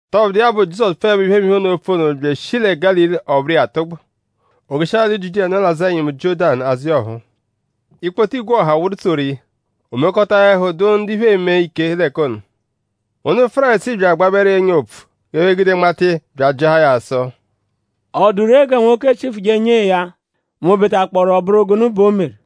Tọbudu iya bụ; Jizọsu pfuẹbeepho iphemiphe ono, oopfu ono bya eshi lẹ Gálili; ọ bụru iya atụgbu. O jeshia alị Jiudiya, nọ l'azụ ẹnyimu Jiọ́danu azụ iya ọphuu. Ikpoto igwe ọha wụru tsoru iya. O mekọta; ẹhu dụ ndu iphe eme ike l'ẹka ono. Ndu Fárisii bya agbabẹru iya ọ́nyà opfu g'ẹphe gude nmata iya; bya ajịahaa ya sụ: “?Ọ dụ ree gẹ nwoke chịfuje nyee ya mẹ o betakpọoru ọ bụru gụnu bẹ o meru?”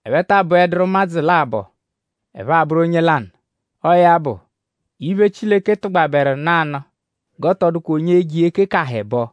Ẹphe taa bụeduru ụmadzu labọ. Ẹphe abụru onye lanụ. Ọo ya bụ; iphe, Chileke tụgbaberu nanụ g'ọ tọ dụkwa onye e-je iya ekekaha ẹbo.”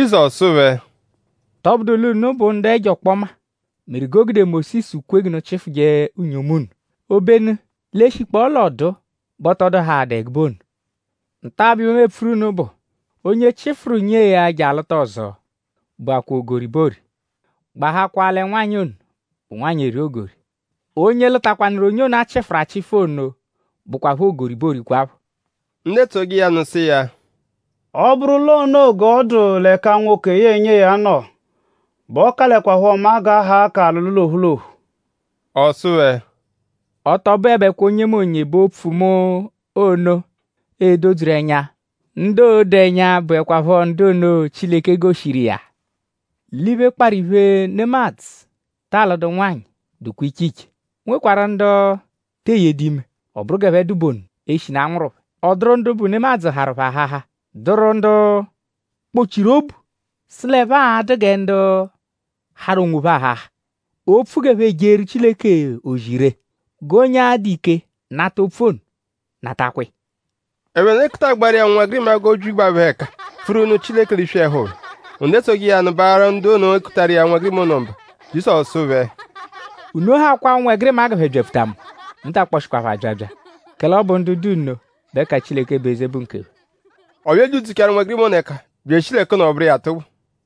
Jizọsu sụ phẹ: “Tọbudu l'unu bụ ndu ẹjo ọkpoma meru g'o gude Mósisu kwe g'unu chịfuje unyomu unu. Obenu l'e -shikpọo l'ọduu bẹ ọ tọ dụhaadaa ẹgube ono. Nta-a bụ iphe, mu epfuru unu bụ: Onye chịfuru nyee ya je alụta ọzo bẹ bụakwaa ogori bẹ oori. Gbahakwaa lẹ nwanyị ono bụ nwanyị, eri ogori. Onye lụtakwanuru onye ono, a chịfuru achịfu ono bụkwapho ogori bẹ oorikwaphọ.” Ndu etsoje iya nụ sụ iya: “Ọ -bụru l'onoo g'ọ dụ l'ẹka nwoke yẹe nyee ya nọ bẹ ọ kalẹkwapho mma g'a haa k'alụlu l'ophu l'ophu.” Ọ sụ phẹ: “Ọ tọ bụebekwa onyemonye bẹ opfu mu ono e-dodzuru ẹnya. Ndu oo-do ẹnya bụekwapho ndu ono, Chileke goshiru iya. L'iphe, kparụ iphe, nemadzụ ta alụdu nwanyị dụkwa iche iche. O nwekwarụ ndu te eyedu ime. Ọ bụru g'ẹphe dụ bụ ono eshinu a nwụru phẹ. Ọ dụru ndu bụ nemadzụ harụ phẹ aháhá. Dụru ndu kpọ-chiru obu sụ l'ẹphe a-dụ gẹ ndu harụ onwophẹ aháhá opfu g'ẹphe ejeeru Chileke ozi ree. G'onye, a-dụ ike nata opfu ono natakwa iya.” Ẹphe nọdu ekutagbaaru iya ụnwegirima g'o byibegbaa phẹ ẹka pfuru nụ Chileke l'iswi ẹhu phẹ. Ndu etsoje iya nụ baaharụ ndu ono, ekutaru iya ụnwegirima ono mba. Jizọsu sụ phẹ: “Unu hakwaa ụnwegirima g'ẹphe byapfuta mu. Unu ta akpọshishi phẹ abyabya; kẹle ọ bụ ndu dụ nno bẹ ẹka Chileke bụ eze bụ nkephẹ.” Ọ bya ebyidzuchaaru ụnwegirima ono ẹka bya eshi l'ẹka ono; ọ bụru iya atụgbu.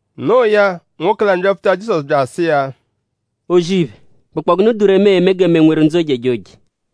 Noo ya; nwoke lanụ byapfuta Jizọsu bya asụ iya: “O-zì-iphe;?bụkpoo gụnu dụ ree, mu e-me gẹ mu e-nweru ndzụ ojejoje.”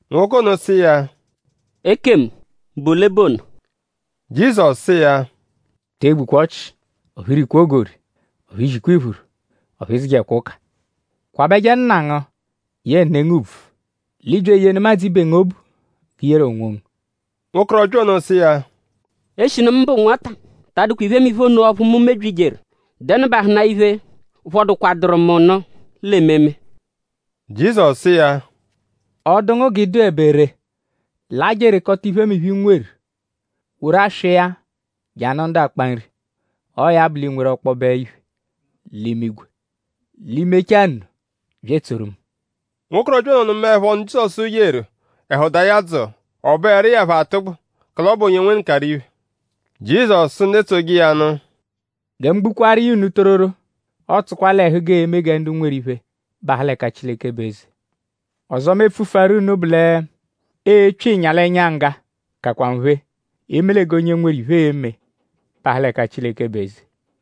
Nwoke ono sụ iya: “Ekemu?bụ ole bụ ono?” Jizọsu sụ iya: “Te egbukwa ọchi; ọphu i rikwa ogori; ọphu i zikwa iphuru; ọphu ị dzụjekwa ụka. Kwabẹje nna ngu yẹe ne ngu ùbvù; l'ị bya eyee nemadzụ ibe ngu obu g'i yeru onwongu.” Nwokorọbya ono sụ iya: “Eshinu mu bụ nwata ta adụkwa iphemiphe ono ọphu mu mebyijeru.?Dẹnubahuna iphe, phọdukwaduru mu nụ l'ememe?” Jizọsu sụ iya: “Ọ -dụ ngu g'ị dụebe ree; laa je erekọta iphemiphe, i nweru; woru aswa iya je anụ ndu akpa nri. Ọo ya bụ; l'ii-nweru ọkpobe iphe l'imigwe. I -mechaa nno; bya etsoru mu.” Nwokorọbya ono nụmaepho ọnu, Jizọsu yeru; ẹhu daa ya dzụu. Ọ bụeru iya phọ atụgbu; kẹle ọ bụ onye nwenụkaru iphe. Jizọsu sụ ndu etsoje iya nụ: “Gẹ mu gbukwaaru iya unu tororo; ọotsukwa l'ẹhu g'ee-me gẹ ndu nweru iphe bahụ l'ẹka Chileke bụ eze.” Ọzo, mu e-pfufuaru unu bụ lẹ: epyo ịnya l'ẹnya ngga kakwa nphe; eme lẹ g'onye nweru iphe e-me bahụ l'ẹka Chileke bụ eze.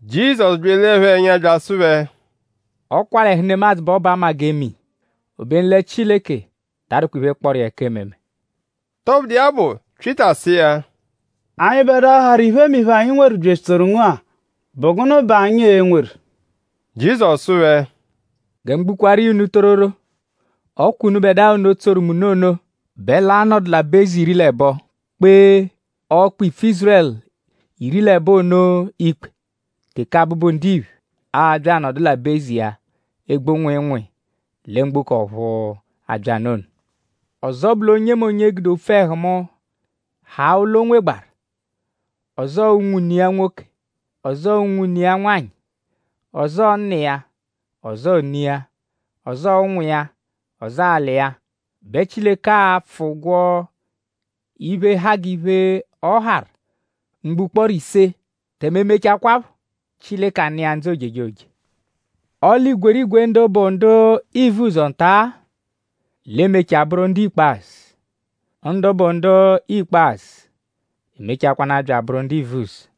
Jizọsu bya elee phẹ ẹnya bya asụ phẹ: “Ọ kwa l'ẹhu nemadzụ bẹ ọ bụ 'ama-g'ee-me-iya; obenu lẹ Chileke ta adụkwa iphe, kpọru iya ẹka ememe.” Tọbudu iya bụ; Pyịta sụ iya: “Anyịbedua, harụ iphemiphe, anyi nweru bya etsoru ngu-a?bụ gụnu bẹ anyi e-nweru?” Jizọsu sụ phẹ: “Gẹ mu gbukwaaru iya unu tororo; ọ kwa unubẹdua ono, tsoru mu nụ ono bẹ l'a-nọdu l'aba-eze iri l'ẹbo; kpee ọkpa-ipfu Ízurẹlu iri l'ẹbo ono ikpe; teke Abụbu-Ndiphe a-bya anọdu l'aba-eze iya, egbu nwịinwii lẹ mgboko ọ̀phúú, abya nụ ono. Ọzo bụ l'onyemonye, gude opfu ẹhu mu haa ụlo, o nwegbaarụ; ọzoo unwune iya nwoke; ọzoo unwune iya nwanyị; ọzoo nna iya; ọzoo ne iya; ọzoo ụnwu iya; ọzoo alị iya; bẹ Chileke a-pfụ ụgwo iphe, ha g'iphe, ọ harụ mgbo ụkporo ise; tẹme e -mechakwaphọ Chileke anụ iya ndzụ ojejoje. Ọle igwerigwe ndu bụ ndu ivuzọ nta-a l'e-mechaa bụru ndu ikpazụ; ndu bụ ndu ikpazụ emechakwanaa bya abụru ndu ivuzọ.”